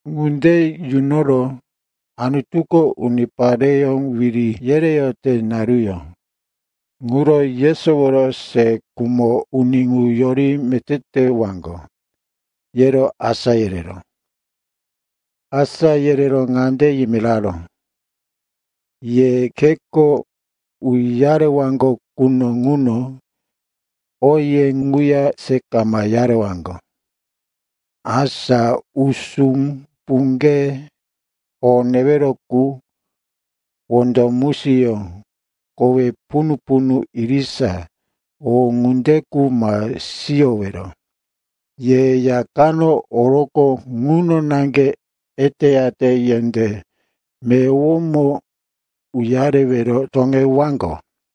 Ŋunde yunoro, Anutuko unipareyó wiri yereyote naruyó ŋuro yesoworo se khumo uni ŋu yori meté tewaŋgo, yero asá yereró. Asá yerero ŋande yimiraró, “Ye kheko uyarewaŋgo quno ŋuno oye ŋuya se kama uyarewaŋgo. Asa usú, puŋge, o newero qu, wondo musiyó, kowe punu-punu irisa, o ŋunde qu ma siyowero. Ye ya kano oroqo ŋuno naŋge eteyate yendé meyowomo uyarewero toŋewaŋgo.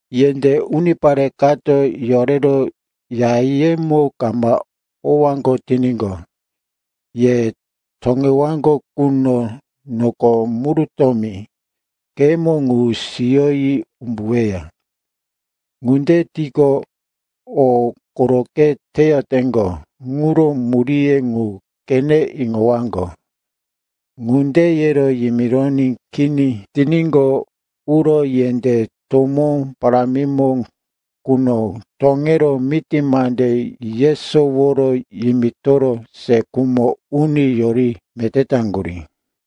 Yendé unipare kato yorero yayemo kama owaŋgo tiníqo, ye toŋewaŋgo quno noko murutómi kheyemo ŋu siyoyi umbuweya. Ŋunde tiqo, o koroqe teyoteŋgo ŋuro muríye ŋu qene iŋowaŋgo.” Ŋunde yero yimironí kini tiníqo, uro yendé tomó, parámimo ŋuno toŋero miti mande yesoworo yimitoro se khumo uni yori meté taŋgurí.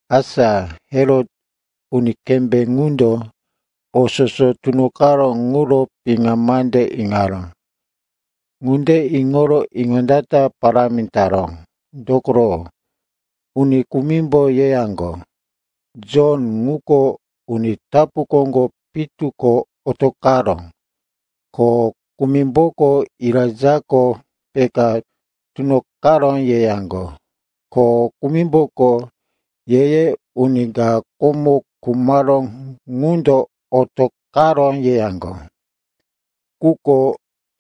Asa Herot, uni kembé ŋundo, o soso tunoqaró ŋuro piŋa mande iŋaró. Ŋunde iŋoro iŋondata parámi taró, dokoro uni kumimbo yeyaŋgo, Jon ŋuko uni tapu koŋgo pitu ko otoqaró, ko kumimboko, Elaijako peka tunoqaró, yeyaŋgo, ko kumimboko, ye-ye uni ka komo khumaró ŋundo otoqaró, yeyaŋgo. Quko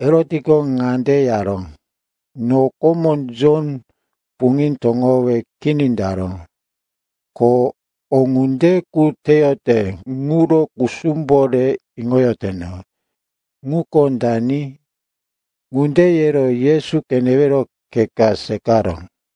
Herotko ŋande yaró, “No komo Jon puŋí toŋowe kini taró. Ko o ŋunde qu teyote ŋuro kusumbo re iŋoyoteno, ŋuko dani?” Ŋunde yero Yesu qenewero khe ka seqaró.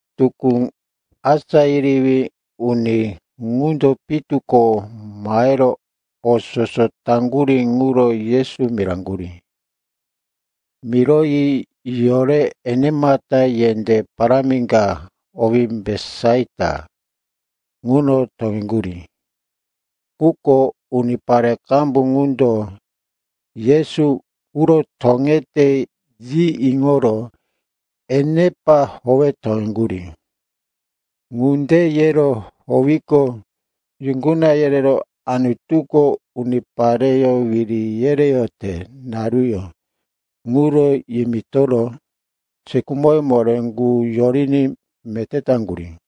Tukú asá yerewí uni ŋundo pitu ko mahero o soso taŋgurí ŋuro Yesu miraŋgurí. Miroyi yorero enemata yendé parámi ka, owí Betisaita, ŋuno toŋeŋgurí. Quko unipare qambu qundo, Yesu uro toŋete, yi iŋoro enepa howe toŋeŋgurí. Ŋunde yero howiqo, yuŋguna yerero Anutuko unipareyó wiri yereyote naruyó ŋuro yimitoro se khumoye moré qu yoriní meté taŋgurí.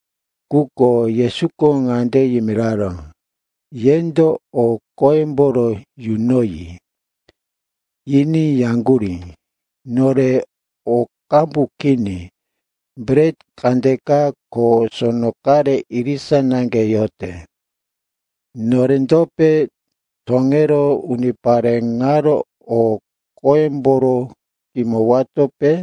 Quko Yesuko ŋande yimiraró, “Yendo o qoyemboro yunoyi.” Yiní yaŋgurí, “Nore o qambu kini, bret kandeka ko sono qare irisa naŋge yote. Norendope toŋero unipare ŋaro o qoyemboro kimowatope?”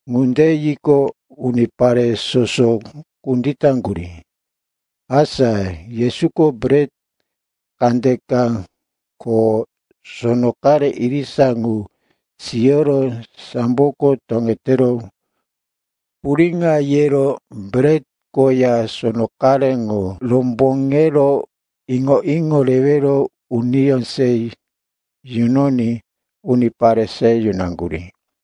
Ŋunde yiqo, unipare soso kunditaŋgurí. Asa Yesuko bret kandeka ko sono qare irisa ŋu siyoro samboko toŋetero puriŋo yero bret koya sono qare ŋu romboŋero iŋo-iŋo rewero uniyó se yunoní unipare se yunaŋgurí.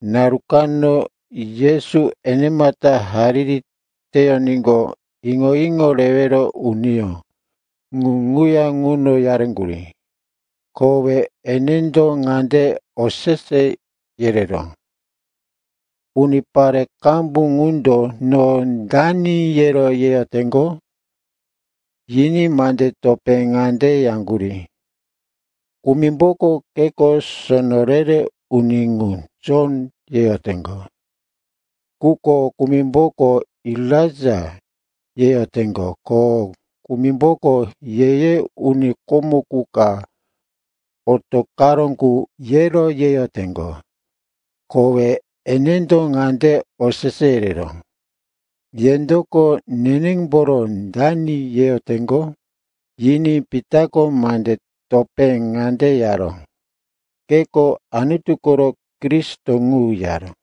Naru kano Yesu enemata hariri teyoníqo, iŋo-iŋo rewero uniyó ŋu ŋuya ŋuno yaŋgurí. Kowe enendo ŋande osese yereró, “Unipare qambu ŋundo, no dani, yero yeyoteŋgo?” Yiní mande topé ŋande yaŋgurí, “Kumimboko keko sono re-re uni ŋu, Jon, yeyoteŋgo. Quko kumimboko, Elaija, yeyoteŋgo, ko kumimboko, ye-ye uni komo qu ka otoqaró qu, yero yeyoteŋgo.” Kowe enendo ŋande osese yereró, “Yendoko nenemboro dani yeyoteŋgo?” Yiní Pitako mande topé ŋande yaró, “Keko Anutu koro Kristo ŋu,” yaró.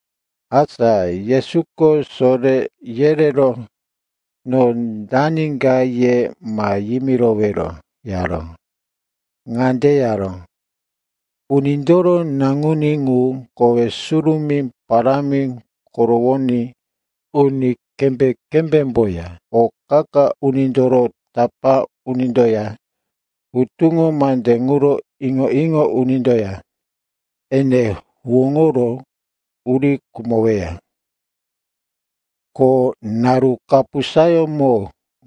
Asa Yesuko soré yerero, no dani ka ye ma yimirowero, yaró. Ŋande yaró, “Unindoro Naŋuní ŋu kowe surumí parámi korowoní, uni kembé-kembémboya o qa-qa unindoro tapá unindoya hutuŋo mande ŋuro iŋo-iŋo unindoya ene huwóŋoro uri khumoweya. Ko naru kapusayómo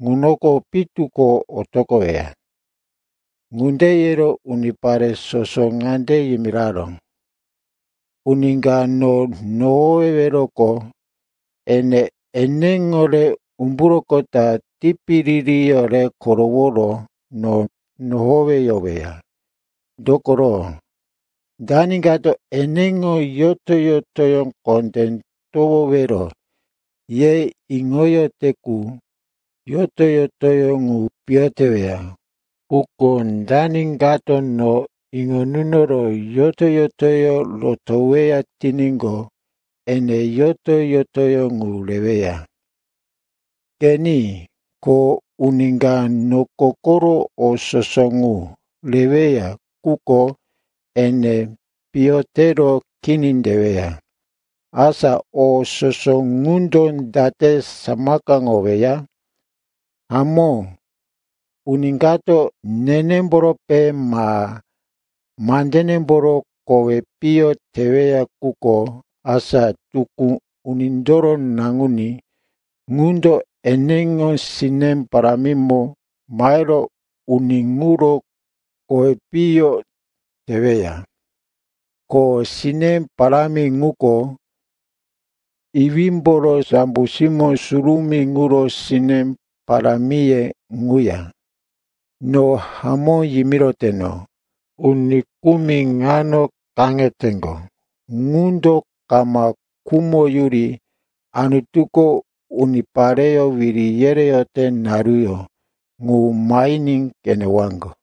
ŋuno pitu ko otoqoweya.” Ŋunde yero unipare soso ŋande yimiraró, “Uni ka no nohoweweroqo, ene eneŋo re umburoqota, tipiririyó re koroworo no nohoweyoweya. Dokoro, dani kato eneŋo yoto-yotoyó kondé towowero ye iŋote qu, yoto-yotoyó ŋu piyo teweya. Quko dani kato no iŋo nunoro yoto-yotoyó rotoweya tiníqo, ene yoto-yotoyó ŋu reweya. “Qeni, ko uni ka noko koro o soso ŋu reweya, quko ene piyo tero kini teweya, asa o soso ŋundo date samakaŋoweya? Hamó, uni kato nenemborope ma mandenemboro kowi piyo teweya quko, asa tukú Unindoro Naŋuní ŋundo eneŋo sine parámimo mahero uni ŋuro kowi piyo teweya. Ko sine parámi ŋuko iwímboro, sambo simó surumí ŋuro sine parámiye ŋuya. No hamó yimiroteno, uni kumi ŋano kaŋeteŋgo qundo kama khumoyuri Anutuko unipareyó wiri yereyote naruyó ŋu mahiní qenewaŋgo.”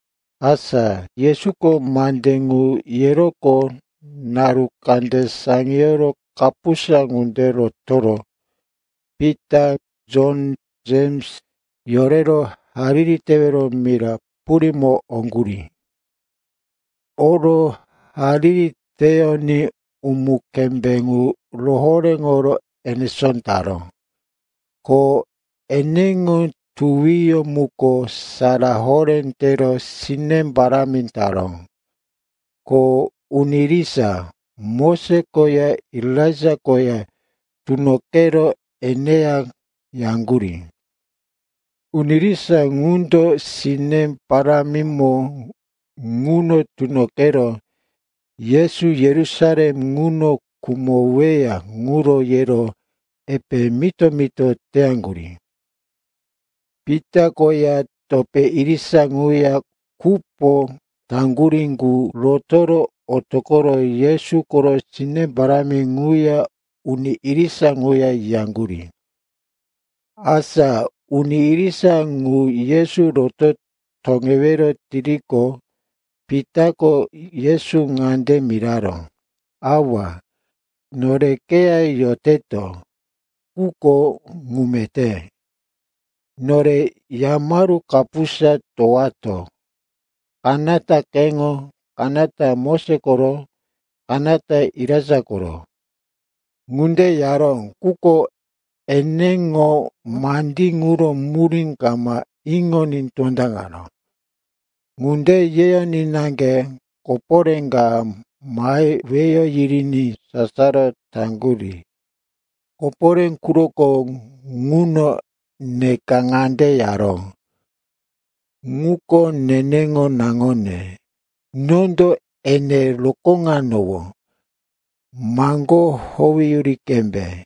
Asa Yesuko mande ŋu yeroqo naru kande saŋiyoro kapusa ŋunde rotoro Pita, Jon, Jems yorero hariri tewero mira purímo oŋgurí. Oro hariri teyoní umu-kembé ŋu rohoréŋo enesó taró, ko eneŋo tuwiyó muko sara horé tero sine parámi taró. Ko uni irisa, Moses koya Elaija koya tunoqero eneya yaŋgurí. Uni irisa ŋundo sine parámimo ŋuno tunoqero Yesu Yerusalem ŋuno khumoweya ŋuro yero epe mito-mito teyaŋgurí. Pita koya topé irisa ŋuya kupo taŋgurí ŋu rotoro otoqoro Yesu koro sine parámi ŋuya uni irisa ŋuya yiyaŋgurí. Asa uni irisa ŋu Yesu roto toŋewero tiriqo, Pitako Yesu ŋande miraró, “Awa, nore keya yoteto quko ŋu meté. Nore yamaru kapusa towowato, kanata keŋo, kanata Moses koro, kanata Elaija koro.” (Ŋunde yaró, quko eneŋo mandí ŋuro murí kama iŋoní tondaŋaró.) Ŋunde yeyoní naŋge koporé ka mahe weyo yiriní sasaro taŋgurí. Koporé quroko ŋuno neka ŋande yaró, “Ŋuko neneŋo naŋone. Nondo ene rokóŋanowó. Maŋgó howeyuri qembe.”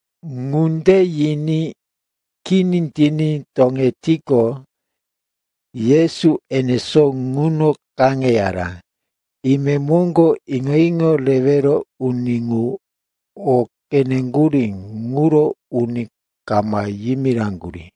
Ŋunde yiní kini tiní toŋetiqo, Yesu enesó ŋuno kaŋeyaró. Imemoŋgo iŋo-iŋo rewero uni ŋu o qeneŋgurí ŋuro uni kama yimiraŋgurí.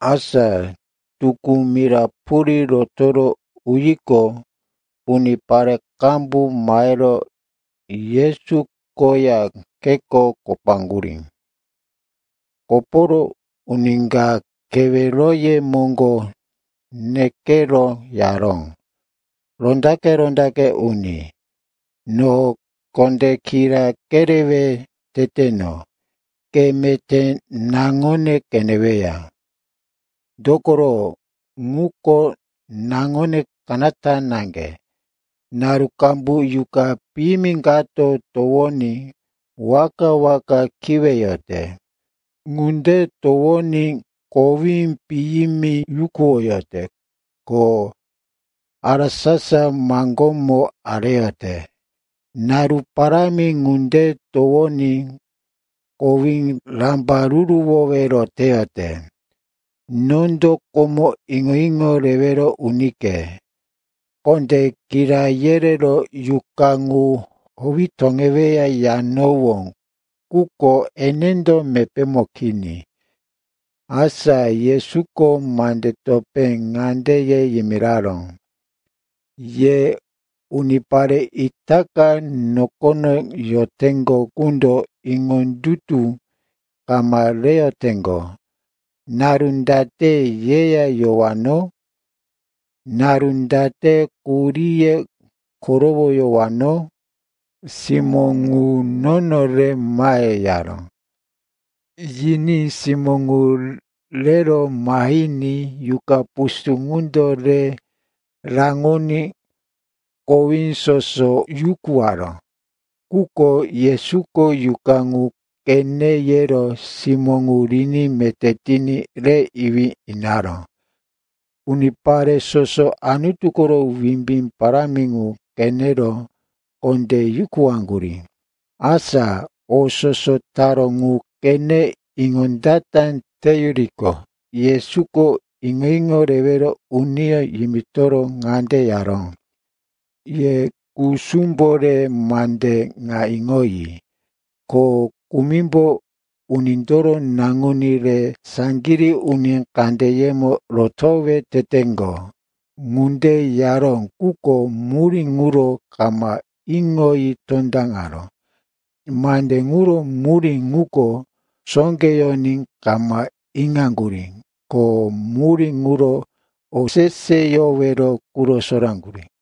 Asa tukú mira purí rotoro uyiqo, unipare qambu mahero Yesu koya kheko kopaŋgurí. Koporo uni ka keweroye moŋgo nekero yaró, “Rondaqe-rondaqe uni, no kondé kira kerewe teteno, ke meté naŋone qeneweya. Dokoro ŋuko naŋone kanata naŋge. Naru qambu yuqa piyimi kato towoní waka-waka kiweyote. Ŋunde towoní kowí piyimi yukuwoyote ko harasasa maŋgómo areyote. Naru parámi ŋunde towoní kowí rambaruruwowero teyote. Nondo komo iŋo-iŋo rewero unike kondé kira yerero, yuqa ŋu howi toŋeweya, yanowó. Quko enendo mepémo kini.” Asa Yesuko mande topé ŋande ye yimiraró, “Ye unipare itaka nokono yoteŋgo qundo iŋondutu kama reyoteŋgo! Naru date yeya yowano? Naru date quhuríye korowoyowano? Simó ŋu nono re mahe,” yaró. Yiní simó ŋu rero mahiní yuqa pusú ŋundo re raŋoní kowí soso yukuwaró. Quko Yesuko yuqa ŋu qene yero simó ŋu riní meté tiní re iwí inaró. Unipare soso Anutu koro wimbí parámi ŋu qenero kondé yukuwaŋgurí. Asa o soso taró ŋu qene iŋondata teyuriqo, Yesuko iŋo-iŋo rewero uniyó yimitoro ŋande yaró, “Ye kusumbo re mande ŋa iŋoyi. Ko kumimbo Unindoro Naŋuní re saŋgirí uni kandeyemo rotowe teteŋgo.” Ŋunde yaró, quko murí ŋuro kama iŋoyi tondaŋaró. Mande ŋuro murí ŋuko sóqeyoní kama iŋaŋgurí. Ko murí ŋuro oseseyowero quro soraŋgurí.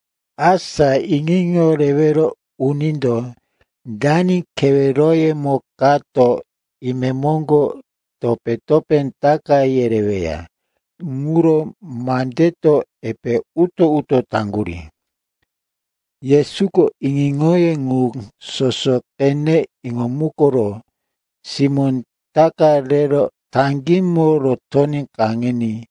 Asa iŋo-iŋo rewero unindo dani keweroyemo kato imemoŋgo topé-topé taka yereweya ŋuro mandeto epe uto-uto taŋgurí. Yesuko iŋo-iŋoye ŋu soso qene iŋomukoro simó ta ka rero taŋgímo rotoní kaŋiní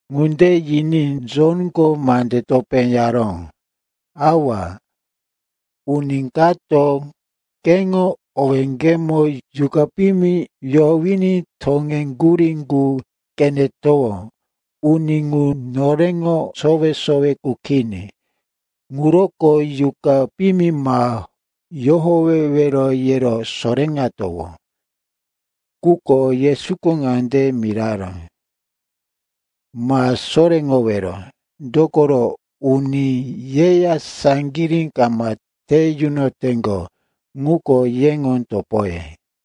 Ŋunde yiní Jonko mande topé yaró, “Awa, uni kato keŋo owéŋgepo yuqa piyimi yohowiní toŋeŋgurí ŋu qenetowó. Uni ŋu noreŋo sowe-sowe qu kini. Ŋuroko yuqa piyimi, ma yohowewero, yero soréŋatowó.” Quko Yesuko ŋande miraró, “Ma soréŋowero. Dokoro uni yeya saŋgirí kama te yunoteŋgo ŋuko yeŋo topoye.”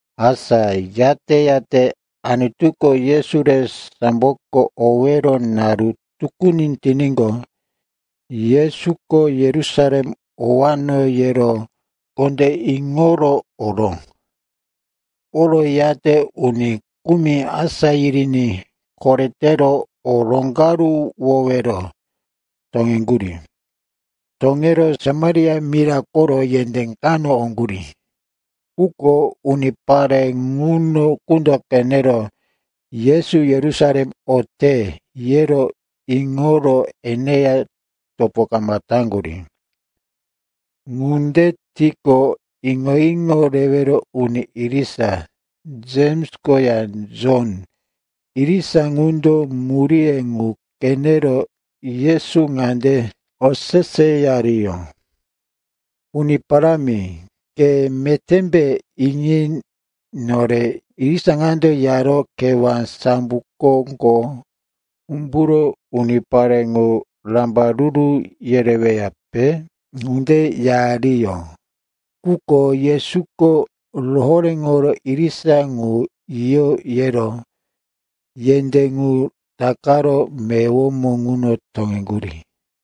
Asa yate-yate Anutuko Yesu re samboko owero naru tukuni tiníqo, Yesuko, Yerusalem owano, yero kondé iŋoro oró. Oroyate uni kumi asá yiriní koretero o roŋgaruwowero toŋeŋgurí. Toŋero Samaria mira koro yendé kano oŋgurí. Quko unipare ŋuno qundo qenero, Yesu Yerusalem ote, ye iŋoro eneya topo kama taŋgurí. Ŋunde tiqo, iŋo-iŋo rewero uni irisa Jems koya Jon, irisa ŋundo muríye ŋu qenero Yesu ŋande oseseyariyó, “Uni Parámi, ke metémbe iŋi nore irisa ŋando yaro kewá sambo koŋgo umburo unipare ŋu rambaruru yereweyape?” ŋunde yariyó. Quko Yesuko rohoréŋoro irisa ŋu yiyo yero yendé ŋu takaro meyowomo ŋuno toŋeŋgurí.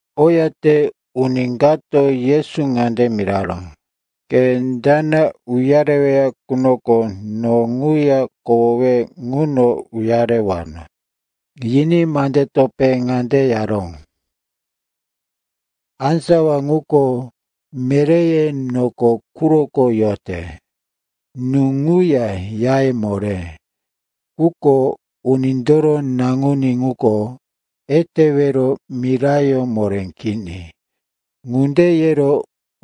Oyate uni kato Yesu ŋande miraró, “Ke dana uyareweya qunoko no ŋuya kohowe ŋuno uyarewano.” Yiní mande topé ŋande yaró, “Á sawa ŋuko meréye noko quroko yote, nú ŋuya yaye moré. Quko Unindoro Naŋuní ŋuko etewero mirayó moré kini.” Ŋunde yero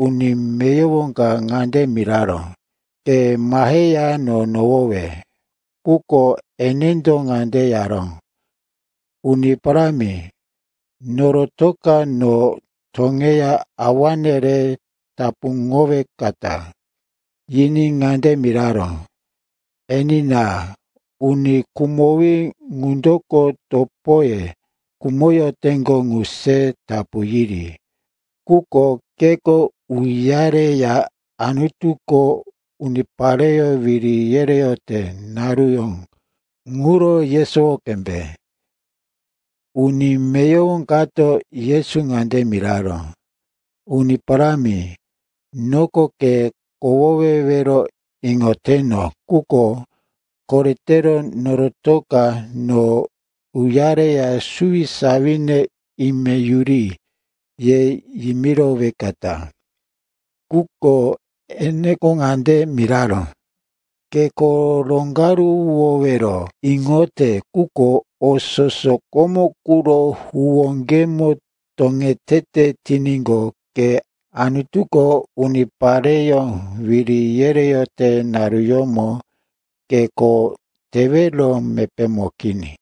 uni meyowo ka ŋande miraró, “Ke maheya no nohowe.” Quko enendo ŋande yaró, “Uni Parámi, norotoka no toŋeya awane re tapuŋowekata.” Yiní ŋande miraró, “Enina, uni khumowí ŋundoko topoye khumoteŋgo ŋu se tapu yiri. Quko keko uyareya Anutuko unipareyó wiri yereyote naruyó ŋuro yesowo qembe.” Uni meyowo kato Yesu ŋande miraró, “Uni Parámi, noko ke kohowewero iŋoteno, quko koretero norotoka no uyareya suwisawine, ime yuri, ye yimirowekata.” Quko eneko ŋande miraró, “Ke kho roŋgaruwowero iŋote, quko o soso komo quro huwóŋgemo toŋetete tiníqo, ke Anutuko unipareyó wiri yereyote naruyómo ke kho tewero mepémo kini.”